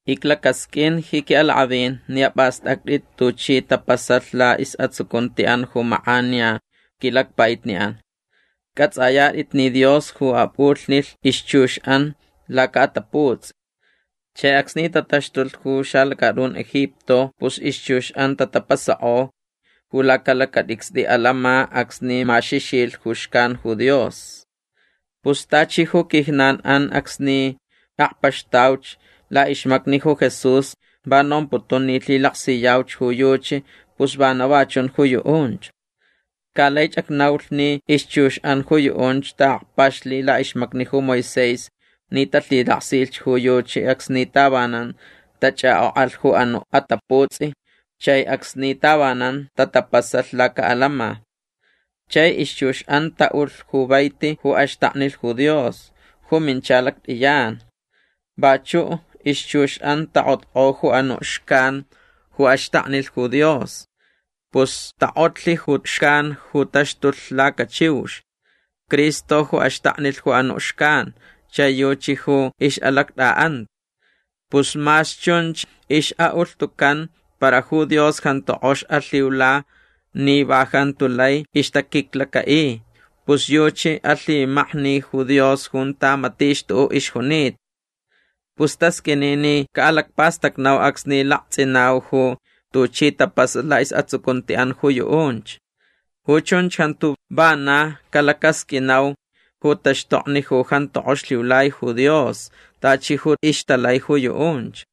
Iclacasqʼuin ji quiʼalakʼavin ni apʼastʼactʼit tuchi tapasalh laʼisʼatsucuntiʼan ju makʼaniya quilacpaʼitniʼan. Cʼatsʼayatʼit ni Dios ju apʼulhnilh ixchuxʼan lacaʼataputsʼi. Chai acsni tataxtulh ju xalacatʼun Egipto pus ixchuxʼan tatapasakʼolh ju lacalacatʼicstʼi alama acsni maxixilh ju xcan ju Dios. Pus tachi ju quijnanʼan acsni akpaxtauch laʼixmacni ju Jesús va nomputun ni lhilaksiyauch ju yuchi pus vana va chunch ju yuʼunch. Ca laich acnaulh ni ixchuxʼan ju yuʼunch taʼakpaxlh laʼixmacni ju Moisés ni talhilaksilh ju yuchi acsni tavanan tachʼakʼokʼalh ju anuʼ ataputsʼi chai acsni tavanan tatapasalh lacaʼalama. Chai ixchuxʼan taʼulh ju vaiti ju axtaknilh ju Dios. Ju mincha lactʼiyan. Vachuʼ ixchuxʼan takʼotkʼo ju anuʼ xcan ju axtaknilh ju Dios. Pus takʼotlh ju xcan ju taxtulh lacachiux. Cristo ju axtaknilh ju anuʼ xcan chai yuchi ju ixʼalactʼaʼanta. Pus mas chunch ixʼaʼulhtucan para ju Dios jantu kʼox alhiula ni va jantu lai ixtaquiclacaʼi. Pus yuchi alhimakni ju Dios junta matich tuʼuʼ ixjunita. Pus tasqʼuini ni caʼalacpastacnau acsni laktsʼinau ju tuchi tapasalh laʼisʼatsucuntiʼan ju yuʼunch. Ju chunch jantu vana calacasqʼuinau ju taxtokni ju jantu kʼox lhiulai ju Dios tachi ju ixtalai ju yuʼunch.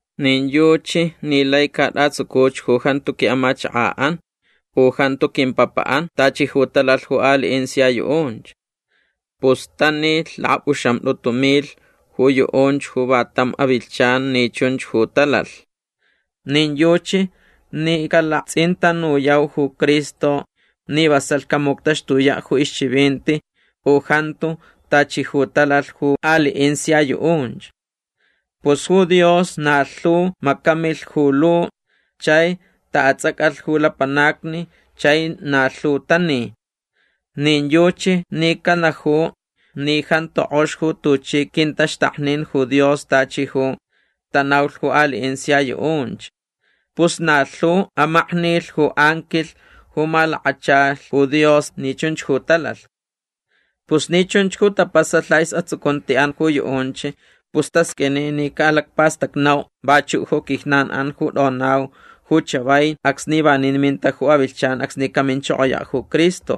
Nin yuchi ni lai catʼatsucuch ju jantu quiʼamachakaʼan u jantu quimpapaʼan tachi ju talalh ju aliʼin sia yuʼunch. Pus tanilh lakapʼuxamtʼutu milh ju yuʼunch ju va tam avilhchan ni chunch ju talalh. Nin yuchi ni calaktsʼintanuyau ju Cristo ni vasalh camuctaxtuyaʼ ju ixchivinti u jantu tachi ju talalh ju aliʼin sia yuʼunch. Pus ju Dios na lhu macamilh ju lu chai taʼatsʼacalh ju lapanacni chai na lhu tani. Nin yuchi ni canaju ni jantu kʼox ju tuchi quintaxtaknin ju Dios tachi ju tanaulh ju aliʼin sia yuʼunch. Pus na lhu amaknilh ju anquilh ju malakachalh ju Dios ni chunch ju talalh. Pus ni chunch ju tapasalh laʼisʼatsucuntiʼan ju yuʼunch pus tasqʼuini ni caʼalacpastacnau vachuʼ ju quijnanʼan ju tʼonau ju chavai acsni vanin minta ju avilhchan acsni caminchokoyaʼ ju Cristo.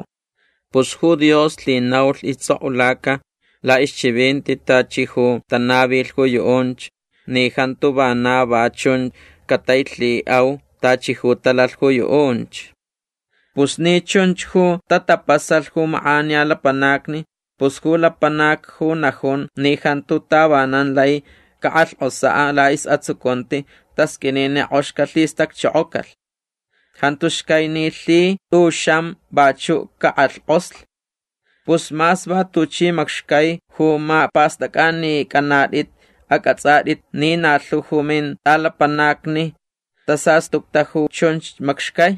Pus ju Dios lhinaulh istsʼokʼulaca laʼixchivinti tachi ju tanavilh ju yuʼunch ni jantu vana va chun catailhiʼau tachi ju talalh ju yuʼunch. Pus ni chunch ju tatapasalh ju makʼaniya lapanacni pus ju lapanac ju najun ni jantu tavanan lai cakʼalhkʼosaʼ laʼisʼatsucunti tasqʼuini ni kʼox calhistacchokocalh. Jantu xcai ni lhi tʼuxam vachuʼ cakʼalhkʼoslh. Pus mas va tuchi macxcai ju mapʼastʼacʼanicʼanatʼit acʼatsʼatʼit ni na lhu ju mintʼalapanacni tasastucta ju chunch macxcai.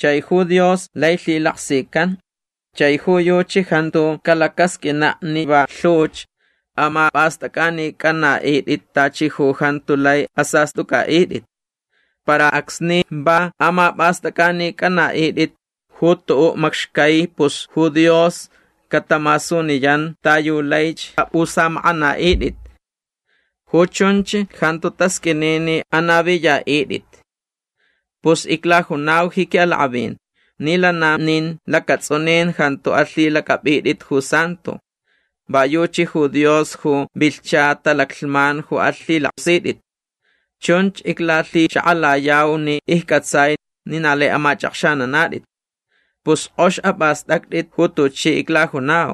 Chai ju Dios lai lhilaksican. Chai ju yuchi jantu calacasqʼuinaʼ ni va lhuch amapʼastʼacʼanicʼanaʼitʼit tachi ju jantu lai asastʼucʼaʼitʼit. Para acsni va amapʼastʼacʼanicʼanaʼitʼit ju tuʼuʼ macxcai pus ju Dios catamasuniyan ta yu laich apʼusamakʼanaʼitʼit. Ju chunch jantu tasqʼuini ni anaviyaʼitʼit. Pus iclajunau ji quiʼalakʼavin ni lana nin lacatsʼunin jantu alhilacʼapʼitʼit ju santo. Va yuchi ju Dios ju vilhcha talaclhman ju alhilaksitʼit. Chunch iclalhixakʼalayau ni iccʼatsai ni na lai amachʼakxananatʼit. Pus kʼox apʼastʼactʼit ju tuchi iclajunau.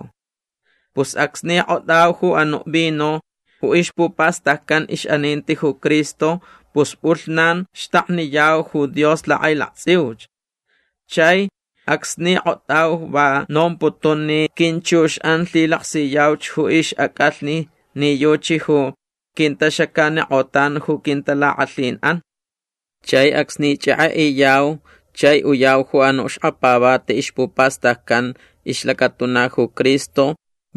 Pus acsni kʼotʼau ju anuʼ vino ju ixpupastaccan ixʼaninti ju Cristo pus pʼulhnan xtakniyau ju Dios lakʼailaktsʼiuch. Chai acsni kʼotʼau va nomputun ni quinchuxʼan lhilaksiyauch ju ixʼacʼalhni ni yuchi ju quintaxacanikʼotan ju quintalakʼalhinʼan. Chai acsni chʼekʼeʼiyau chai uyau ju anuʼ xkapavati ixpupastaccan ixlacatuna ju Cristo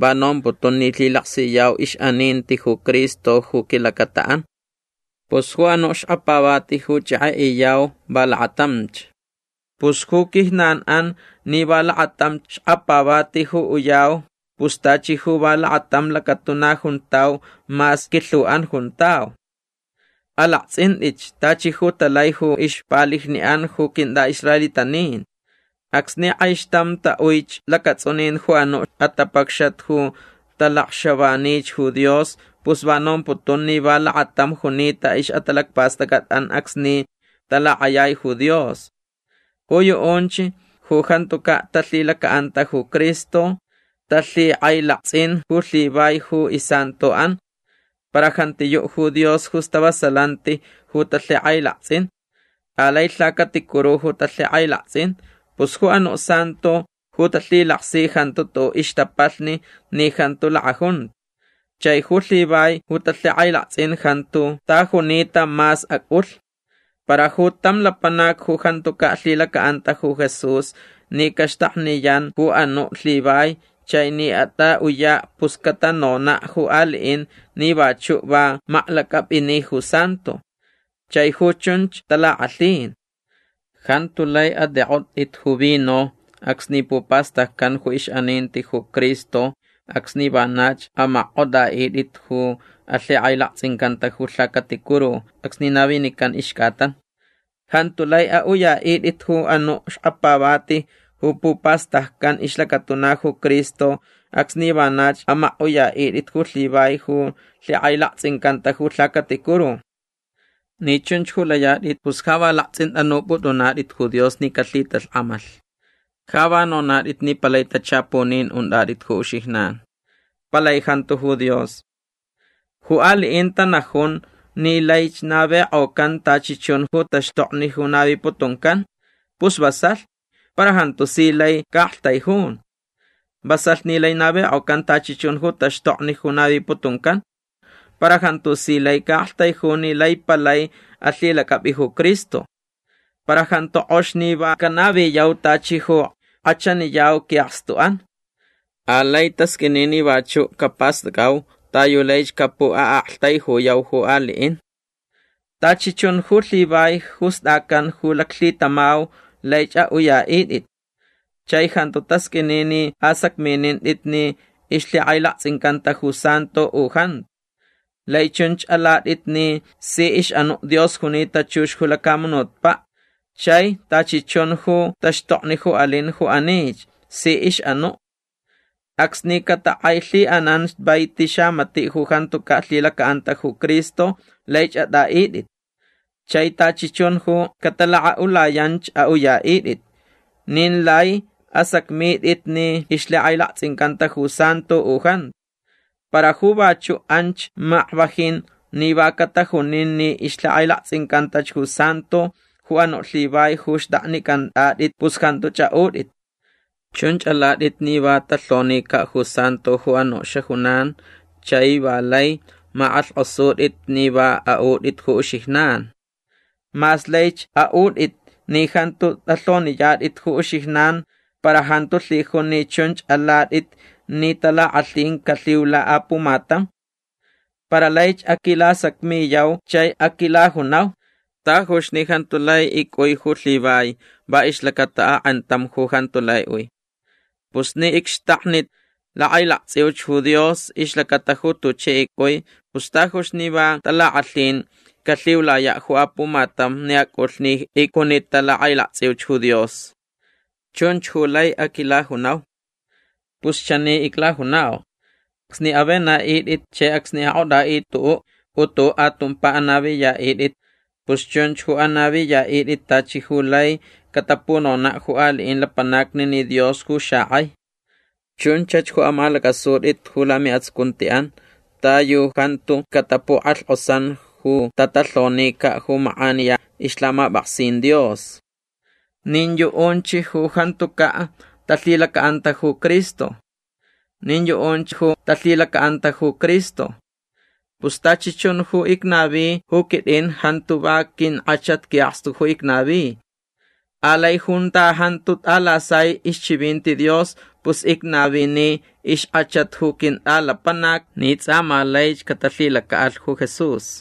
va nomputun ni lhilaksiyau ixʼaninti ju Cristo ju quilacataʼan. Pus ju anuʼ xkapavati ju chʼekʼeʼiyau va lakatamch. Pus ju quijnanʼan ni va lakatam xkapavati ju uyau pus tachi ju va lakatam lacatuna juntau mas quilhuʼan juntau. Alaktsʼintʼitch tachi ju talai ju ixpalijniʼan ju quintʼaʼisraelitanin. Acsni kʼaixtam taʼuich lacatsʼunin ju anuʼ atapacxat ju talacxavanich ju Dios pus va nomputun ni va lakatam junita ixʼatalacpastʼacʼatʼan acsni talakʼayai ju Dios. Ju yuʼunch ju jantucaʼ talhilacaʼanta ju Cristo talhikʼailaktsʼin ju lhivai ju isantoʼan. Para jantiyuʼ ju Dios ju stavasalanti ju talhikʼailaktsʼin. Alai lhacaticuru ju talhikʼailaktsʼin. Pus ju anuʼ santo ju talhilaksi jantu tuʼuʼ ixtapalhni ni jantu lakʼajunta. Chai ju lhivai ju talhikʼailaktsʼin jantu ta junita mas acʼulh. Para ju tam lapanac ju jantucaʼ lhilacaʼanta ju Jesús ni caxtakniyan ju anuʼ lhivai chai ni atʼaʼuyaʼ pus catanonaʼ ju aliʼin ni vachuʼ va maklacʼapʼini ju santo. Chai ju chunch talakʼalhin. Jantu lai atʼikʼotʼit ju vino acsni pupastaccan ju ixʼaninti ju Cristo acsni vanach amakkʼotʼaʼitʼit ju alhikʼailaktsʼincanta ju lhacaticuru acsni navinican ixcʼatan. Jantu lai aʼuyaʼitʼit ju anuʼ xkapavati ju pupastaccan ixlacatuna ju Cristo acsni vanach amakʼuyaʼitʼit ju lhivai ju lhikʼailaktsʼincanta ju lhacaticuru. Ni chunch ju layatʼit pus ja va laktsʼintʼanupʼutʼunatʼit ju Dios ni calhitalhkʼamalh. Ja va nonatʼit ni palai tachapunin untʼatʼit ju uxijnan. Palai jantu ju Dios. Ju aliʼin tanajun ni laich navikʼocan tachi chun ju taxtokni ju naviputuncan. Pus vasalh. Para jantu si lai caʼaktaijun. Vasalh ni lai navikʼocan tachi chun ju taxtokni ju naviputuncan. Para jantu si lai caʼaktaijun ni lai palai alhilacʼapʼi ju Cristo. Para jantu kʼox ni va canaviyau tachi ju kʼachaniyau quiʼakstuʼan. Alai tasqʼuini ni vachuʼ capastʼacʼau ta yu laich capuʼaʼaktaijuyau ju aliʼin. Tachi chun ju lhivai ju stʼacan ju laclhitamau laich aʼuyaʼitʼit. Chai jantu tasqʼuini ni asacminintʼit ni ixlhikʼailaktsʼincanta ju santo u jantu. Lai chunch alatʼit ni si ixʼanuʼ Dios junita chux ju lacamunutpaʼ chai tachi chun ju taxtokni ju alin ju anich. Si ixʼanuʼ. Acsni catakʼailhiʼanan vaiti xamatiʼ ju jantucaʼ lhilacaʼanta ju Cristo laich atʼaʼitʼit. Chai tachi chun ju catalakʼaʼulayanch aʼuyaʼitʼit. Nin lai asacmitʼit ni ixlhikʼailaktsʼincanta ju santo u jantu. Para ju vachuʼ anch makvajin ni va catajunin ni ixlhikʼailaktsʼincantach ju santo ju anuʼ lhivai ju xtʼaknicʼantʼatʼit pus jantuch aʼutʼit. Chunch alatʼit ni va talhonicaʼ ju santo ju anuʼ xajunan chai va lai makʼalhkʼosutʼit ni va aʼutʼit ju uxijnan. Mas laich aʼutʼit ni jantu tʼalhoniyatʼit ju uxijnan para jantu lhijun ni chunch alatʼit ni talakʼalhin calhiula apumatam. Para laich aquilasacmiyau chai aquilajunau: “Tajuch ni jantu lai icʼui ju lhivai va ixlacata akʼantam ju jantu lai ui. Pus ni icxtakni lakʼailaktsʼiuch ju Dios ixlacata ju tuchi icʼui pus tajuch ni va talakʼalhin calhiulayaʼ ju apumatam ni acʼulh ni icjunita lakʼailaktsʼiuch ju Dios”. Chunch ju lai aquilajunau. Pus chani iclajunau. Acsni avenaʼitʼit chai acsni akʼotʼaʼitʼit tuʼuʼ u tuʼuʼ atumpa anaviyaʼitʼit pus chunch ju anaviyaʼitʼit tachi ju laich catapunonaʼ ju aliʼin lapanacni ni Dios ju xakʼai. Chunchach ju amalacʼasutʼit ju lamiʼatsucuntiʼan ta yu jantu catapukʼalhkʼosan ju tatalhonicaʼ ju makʼaniya ixlhamapʼaksin Dios. Nin yuʼunch ju jantucaʼ talhilacaʼanta ju Cristo. Nin yuʼunch ju talhilacaʼanta ju Cristo. Pus tachi chun ju icnavi ju quitʼin jantu va quinkʼachat quiʼakstu ju icnavi. Alai junta jantu tʼalasai ixchivinti Dios pus icnavini ixkʼachat ju quintʼalapanac ni tsʼa ma laich catalhilacaʼalh ju Jesús.